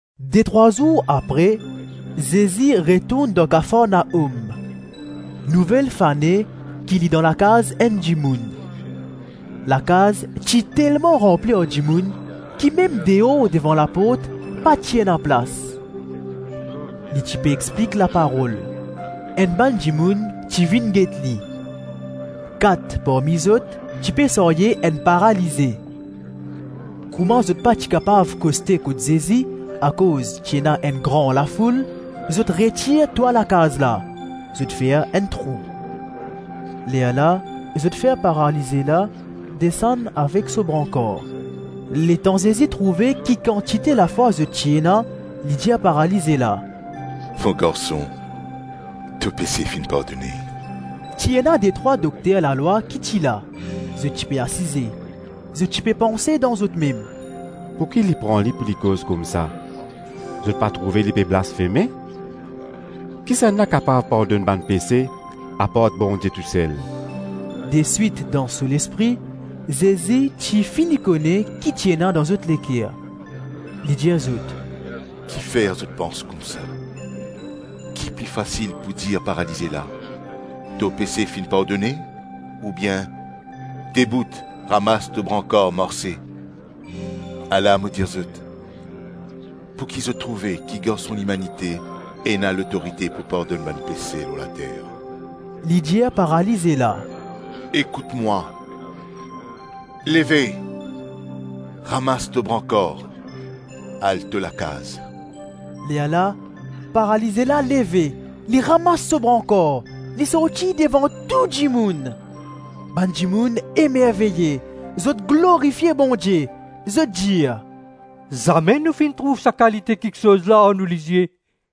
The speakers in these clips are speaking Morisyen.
Detrwa zour apre, Zezi retourn dan Kafarnaom. Nouvel fane ki li dan lakaz enn dimoun. Lakaz ti telman ranpli ar dimoun, ki mem deor devan laport pa ti ena plas. Li ti pe explik laparol. Enn bann dimoun ti vinn get li. Kat parmi zot, ti pe sarye enn paralize. Kouma zot pa ti kapav koste kot Zezi, akoz ti ena enn gran lafoul, zot retir twa lakaz la, zot fer enn trou. Lerla, zot fer paralize la desann avek so brankar. Letan Zezi trouve ki kantite lafwa zot ti ena, li dir paralize la, “Mo garson, to pese finn pardone.” Ti ena detrwa dokter lalwa ki ti la; zot ti pe asize. Zot ti pe panse dan zot mem, “Pou ki li pran li pou li koz koumsa? Zot pa trouve li pe blasfeme! Kisannla kapav pardonn bann pese apart Bondie tousel?” Deswit dan so lespri, Zezi ti fini kone ki ti ena dan zot leker. Li dir zot, “Kifer zot pans koumsa? Ki pli fasil pou dir paralize la, ‘To pese finn pardone’ ou bien, ‘Debout, ramas to brankar, marse’? Ala mo dir zot, pouki zot trouve ki Garson Limanite ena lotorite pou pardonn bann pese lor later,” - li dir paralize la, “Ekout mwa, leve, ramas to brankar, al to lakaz.” Lerla paralize la leve, li ramas so brankar, li sorti devan tou dimoun. Bann dimoun emerveye. Zot glorifie Bondie, zot dir, “Zame nou finn trouv sa kalite kiksoz la ar nou lizie.”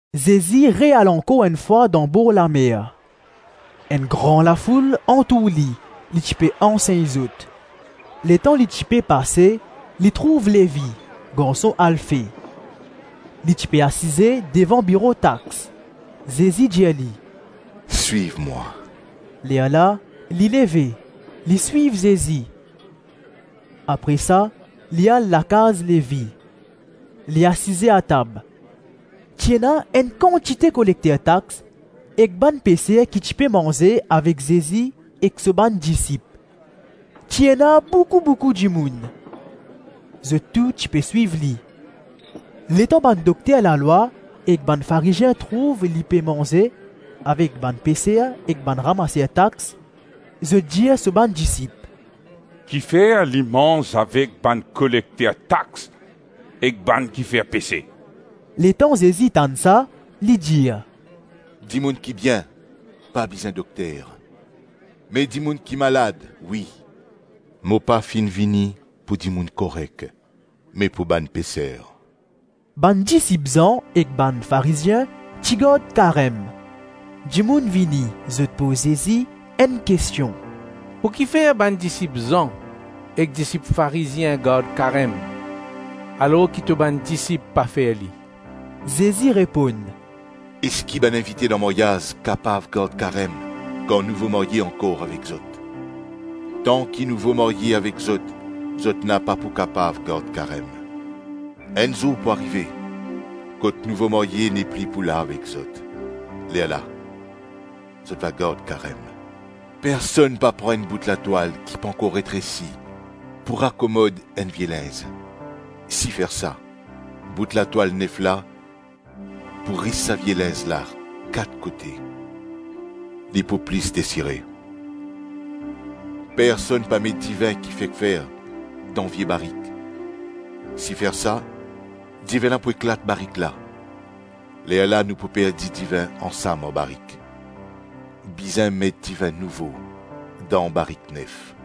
Zezi re-al ankor enn fwa dan borlamer. Enn gran lafoul antour li; li ti pe ansegn zot. Letan li ti pe pase, li trouv Levi, garson Alfe. Li ti pe asize devan biro tax. Zezi dir li, “Swiv mwa.” Lerla, li leve, li swiv Zezi. Apre sa, li al lakaz Levi. Li asize atab. Ti ena enn kantite kolekter tax ek bann peser ki ti pe manze avek Zezi ek so bann disip. Ti ena boukou-boukou dimoun. Zot tou ti pe swiv li. Letan bann dokter lalwa ek bann Farizien trouv li pe manze avek bann peser ek bann ramaser tax, zot dir so bann disip, “Kifer li manz avek bann kolekter tax ek bann ki fer pese?” Letan Zezi tann sa, li dir, “Dimoun ki bien pa bizin dokter me dimoun ki malad, wi; mo pa finn vini pou dimoun korek me pou bann peser.” Bann disip Zan ek bann Farizien ti gard karem. Dimoun vini, zot poz Zezi enn kestion, “Pou kifer bann disip Zan ek disip Farizien gard karem alor ki to bann disip pa fer li?” Zezi reponn, “Eski bann invite dan maryaz kapav gard karem kan nouvo marye ankor avek zot? Tanki nouvo marye avek zot, zot napa pou kapav gard karem. Enn zour pou arive, kot nouvo marye nepli pou la avek zot, lerla zot va gard karem. Personn pa pran enn bout latwal ki pankor retresi pou rakomod enn vie linz; si fer sa, bout latwal nef la pou ris sa vie linz la kat kote, li pou plis desire. Personn pa met divin ki fek fer dan vie barik; si fer sa, divin la pou eklat barik la, lerla nou pou perdi divin ansam ar barik. Bizin met divin nouvo dan barik nef.”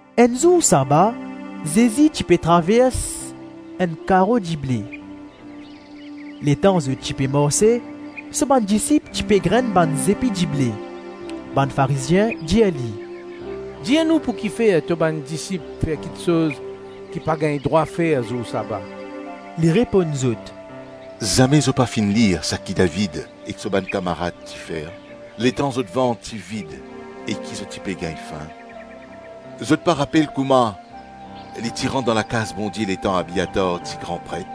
Enn zour saba, Zezi ti pe travers enn karo dible. Letan zot ti pe marse, so bann disip ti pe grenn bann zepi dible. Bann Farizien dir li, “Dir nou pou kifer to bann disip fer kiksoz ki pa gagn drwa fer zour saba?” Li reponn zot, “Zame zot pa finn lir saki David avek so bann kamarad ti fer, letan zot vant ti vid e ki zot ti pe gagn fin? Zot pa rapel kouma li ti rant dan lakaz Bondie letan Abiatar ti gran pret?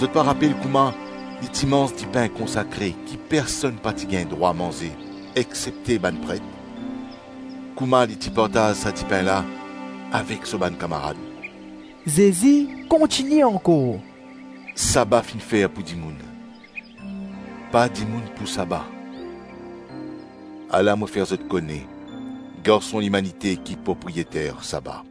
Zot pa rapel kouma li ti manz dipin konsakre ki personn pa ti gagn drwa manze, exsepte bann pret? Kouma li ti partaz sa dipin la avek so bann kamarad?” Zezi kontigne ankor, “Saba finn fer pou dimoun, pa dimoun pou saba. Ala mo fer zot kone, Garson Limanite ki propriyeter saba.”